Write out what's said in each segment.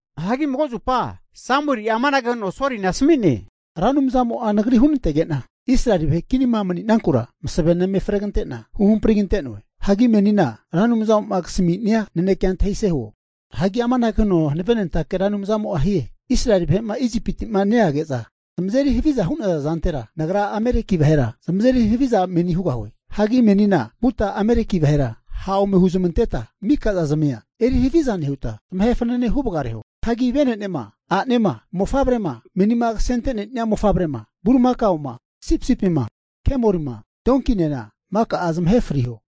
Hagi mago zupa Samueli'a amanage huno Solina asami'ne, Ra Anumzamo'a nagri hunantege'na Israeli vahe kinima mani'nankura masavena eme fregante'na huhampri kante'noe. Hagi menina Ra Anumzamo'ma kasami'nia nanekea antahise huo. Hagi amanage huno hanavenentake Ra Anumzamo'a hie, Israeli vahe'ma Isipinti'ma neage'za zamazeri haviza hu'naza zantera, Nagra Ameleki vahera zamazeri haviza menina hugahue. Hagi menina vuta Ameleki vahera ha' ome huzmanteta mika zazimia eri haviza nehuta, zamahe fanane hu vagareho. Hagi vene'nema, a'nema, mofavrema, meni kasente'nenia mofavrema bulimakaoma, sipisipima, kemolima, donkinena mika'a zamahe friho.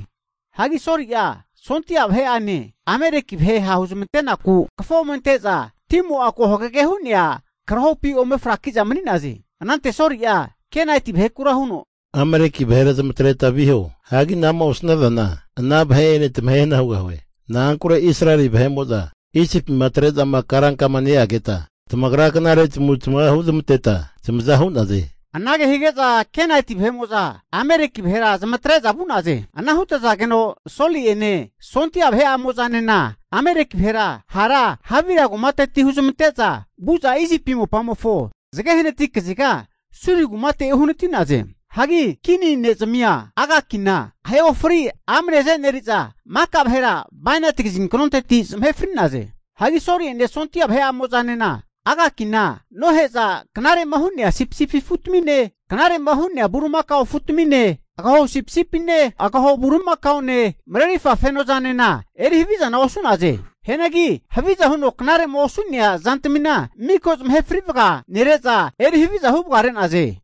Hagi Soli'a sondia vahe'ane Ameleki vahe ha' huzmantenaku kafo ome ante'za timo'a ko hagage hu'nea karahopi ome fraki'za mani'naze. Anante Soli'a Kenaiti vahekura huno, Ameleki vahera zamatreta viho. Hagi ana'ma osnazana ana vahe'ene tamahe hana hugahue. Na'ankure Israeli vahe'mo'zama Isipima atre'za karankama neageta tamagra knare tamavutamava huzmanteta zamaza hu'naze. Anage hige'za Kenaiti vahe'mo'za Ameleki vahera zamatre'za vu'naze. Ana hutazageno Soli'ene sondia vahe'amo'zanena Ameleki vahera hara Havira kumateti huzmante'za vu'za Isipi mopamofo zage hanati kaziga Suri kumate uhanati'naze. Hagi kini ne'zamia Agakina ahe ofri amne aze'neri'za, maka vahera bainati kazinkonteti zamahe fri'naze. Hagi Soli'ene sondia vahe'amozanena Agakina nohe'za, knare'ma hu'nea sipisipi afutamine, knare'ma hu'nea bulimakao afutamine, agaho sipisipine, agaho bulimakaone marerirfa fenozanena eri havizana osu'naze. Hianagi haviza huno knare'ma osu'nea zantamina miko zamahe frivaga nere'za eri haviza huvagare'naze.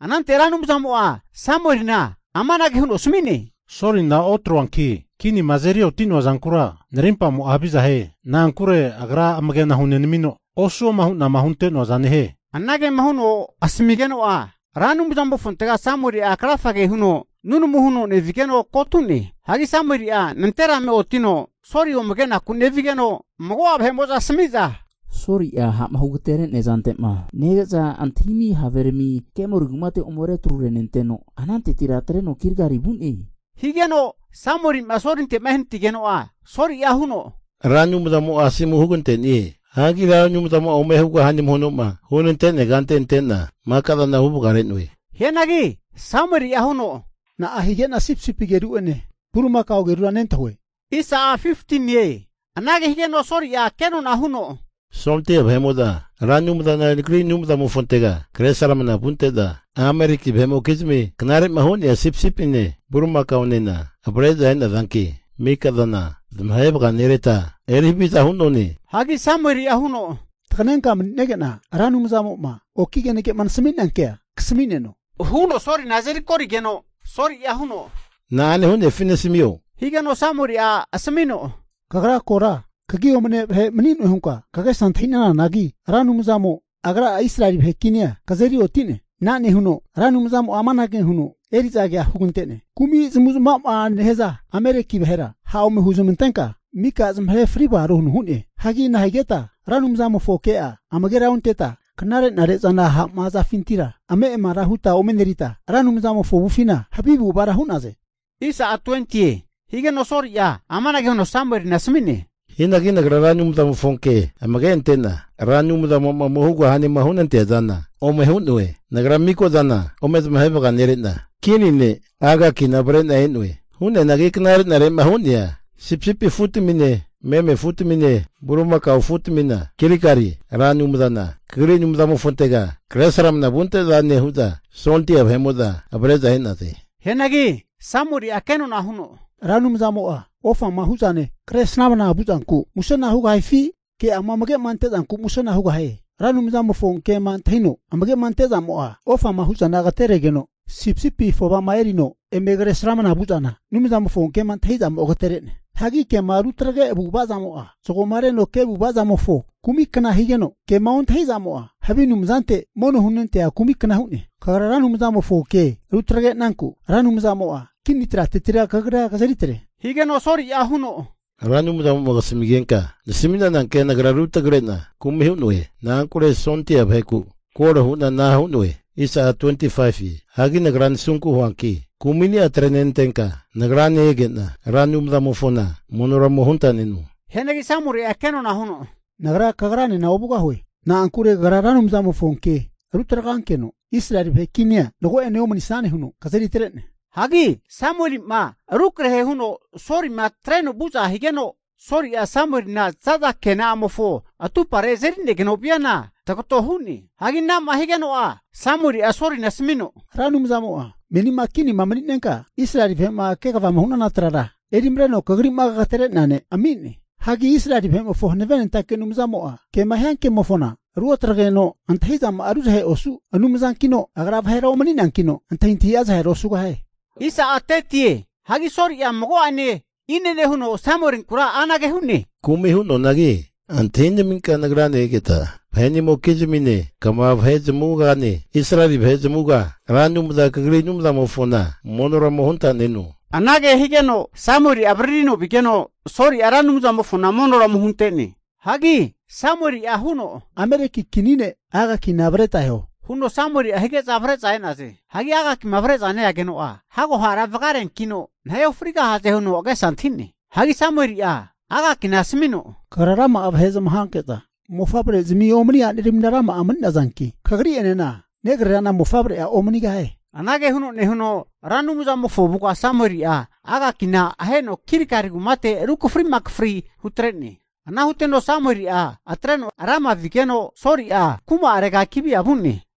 Anante Ra Anumzamo'a Samuelina amanage huno asami'ne, Solina otroanki kinima azeri oti'noa zankura, narimpamo'a haviza hie. Na'ankure agra amagena hunenamino, osuoma hu'na hunte'noaza nehie. Anagema huno asamigeno'a, Ra Anumzamofontega Samueli'a krafage huno nunamuna huno nevigeno kotu'ne. Hagi Samueli'a nanterame otino Soli ome kenaku nevigeno, mago'a vahe'mo'za asami'za, Soli'a ha'ma hugatere'nea zante'ma nege'za antahimi haverami Karmel kumate ome retru renteteno, anantetira atreno Gilgali vu'ne. Higeno Samueli'ma Solinte'ma ehanatigeno'a Soli'a huno, Ra Anumzamo'a asomu hugante'nie. Hagi Ra Anumzamo'ma ome hugahane huno'ma hunante'nea kante ante'na maka zana huvagare'noe. Hianagi Samueli'a huno, Na'a hige'na sipisipi ageru'ene bulimakao agerura nentahue? Anage higeno Soli'a kenona huno, Sondia vahe'mo'za Ra Anumzana kagri Anumzamofontega kresramna vunte'za Ameleki vahe'mokizmi knare'ma hu'nea Sipisipine bulimakaonena avre'za e'nazanki, mika zana zamahe vaganereta eri haviza hu'none. Hagi Samueli'a huno, Taganenka mani'nege'na Ra Anumzamo'ma oki kenage'ma nasami'nea kea kasamineno, huno Solina azeri korigeno Soli'a huno, na'ane hu'nefi nasamio, huno Soli'a hu'ne. Higeno Samueli'a asamino, Kagra kora kagi omane vahe mani'noe hunka kagesa antahi'nananagi, Ra Anumzamo Agra'a Israeli vahe kinia kazeri oti'ne. Ana nehuno Ra Anumzamo'a amanage huno eri'zankea hugante'ne, kumi zamavu'zamava nehaza Ameleki vahera ha' ome huzamantenka mika zamahe fri vagaro huno hu'ne. Hagi nahigeta Ra Anumzamofo ke'a amagera onteta, knare'nare'zana ha'ma hazafintira ame'amara huta omenerita Ra Anumzamofo avufina havi avu'avara hu'naze? Higeno Soli'a amanage huno Samuelina asami'ne, Hianagi nagra Ra Anumzamofo ke amage ante'na Ra Anumzamo'ma ome hugahanema hunanteazana ome hu'noe. Nagra maka'zana ome zamahe vaganere'na Kini ne' Agakina avre'na e'noe. Hianagi knare'nare'ma hu'nea sipisipi afutamine, meme afutamine, bulimakao afutamina Gilgali Ra Anumzana kagri Anumzamofontega kresramna vunte'zane hu'za sondia vahe'mo'za avre'za e'naze. Hianagi Samueli'a kenona huno, Ra Anumzamo'a ofama hu'zane kresramna vuzanku musena hugahifi, ke'ama amage'ma ante'zanku musena hugahie? Ra Anumzamofo kema antahino amage ante'zamo'a, ofama hu'zana agateregeno, sipisipi afovama erino eme kresramna vu'zana, Anumzamofo kema antahi'zamo agatere'ne. Hagi kema rutagre avu'avazamo'a zagomareno ke avu'avazamofo kumi kna higeno, kema ontahi'zamo'a, havi anumzante mono hunentea kumikna hu'ne. Kagra Ra Anumzamofo ke rutrage'nanku, Ra Anumzamo'a kini tratetira kagria kazeri atre. Higeno Soli'a huno, Ra Anumzamo'ma kasamigenka nasami'nana kea nagra rutagre'na kumi hu'noe. Na'ankure sondia vaheku koro hu'na ana hu'noe. Hagi nagra nasunku huanki kumi'ni'a atrenenantenka, nagrane ege'na Ra Anumzamofona monora ome huntaneno. Hianagi Samueli'a kenona huno, Nagra kagranena ovugahue. Na'ankure kagra Ra Anumzamofo ke rutagrankeno Israeli vahe kinia mago'ene omanisane huno kazeri atre'ne. Hagi Samueli'ma rukrahe huno Solima atreno vu'za higeno, Soli'a Samuelina za'za kena'amofo atupa'are azerinegeno viana tagato hu'ne. Hagi ana'ma higeno'a Samueli'a Solina asamino, Ra Anumzamo'a menina kinima mani'nenka Israeli vahe'ma kegavama hu'nana trara erimareno kagrima kagetere'nea ne' ami'ne. Hagi Israeli vahe'mofo Hanavenentake Anumzamo'a, kema hia kemofona ruotagreno, antahi'zama'a ruzahe osu Anumzankino, Agra vahera omani'neankino antahintahi'a zahera osugosie! Hagi Soli'a mago'ene inene huno Samuelinkura anage hu'ne, Kumi hu'noanagi antahinaminka nagrane egeta, vahe'nimokizmine kva vahe zamavugane, Israeli vahe zamavuga Ra Anumzana kagri Anumzamofona monora ome huntaneno. Anage higeno Samueli'a avaririno vigeno Soli'a Ra Anumzamofona monora ome hunte'ne. Hagi Samueli'a huno, Ameleki kini ne' Agakina avreta eho, huno Samueli'a hige'za avre'za e'naze. Hagi Agakima avre'za ne'ageno'a, hago hara vagareankino nahe ofrigahaze huno agesa antahi'ne. Hagi Samueli'a Agakina asamino, Kagra rama'a vahe zamahanke'za mofavrezamia omani aneramina rama'a mani'nazankino, kagri'enena negrerana mofavre'a omanigahie. Anage huno nehuno Ra Anumzamofo avuga Samueli'a Agakina aheno Gilgali kumate rukafri makafri hutre'ne. Ana huteno Samueli'a atreno Rama vigeno, Soli'a kuma arega Gibea vu'ne.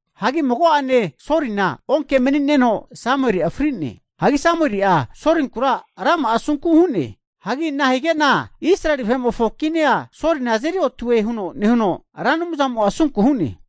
Hagi mago'ane Solina onke mani'neno Samueli'a fri'ne. Hagi Samueli'a Solinkura rama'a asunku hu'ne. Hagi nahigena Israeli vahe'mofo kinia Solina azeri oti'noe huno nehuno, Ra Anumzamo'a asunku hu'ne.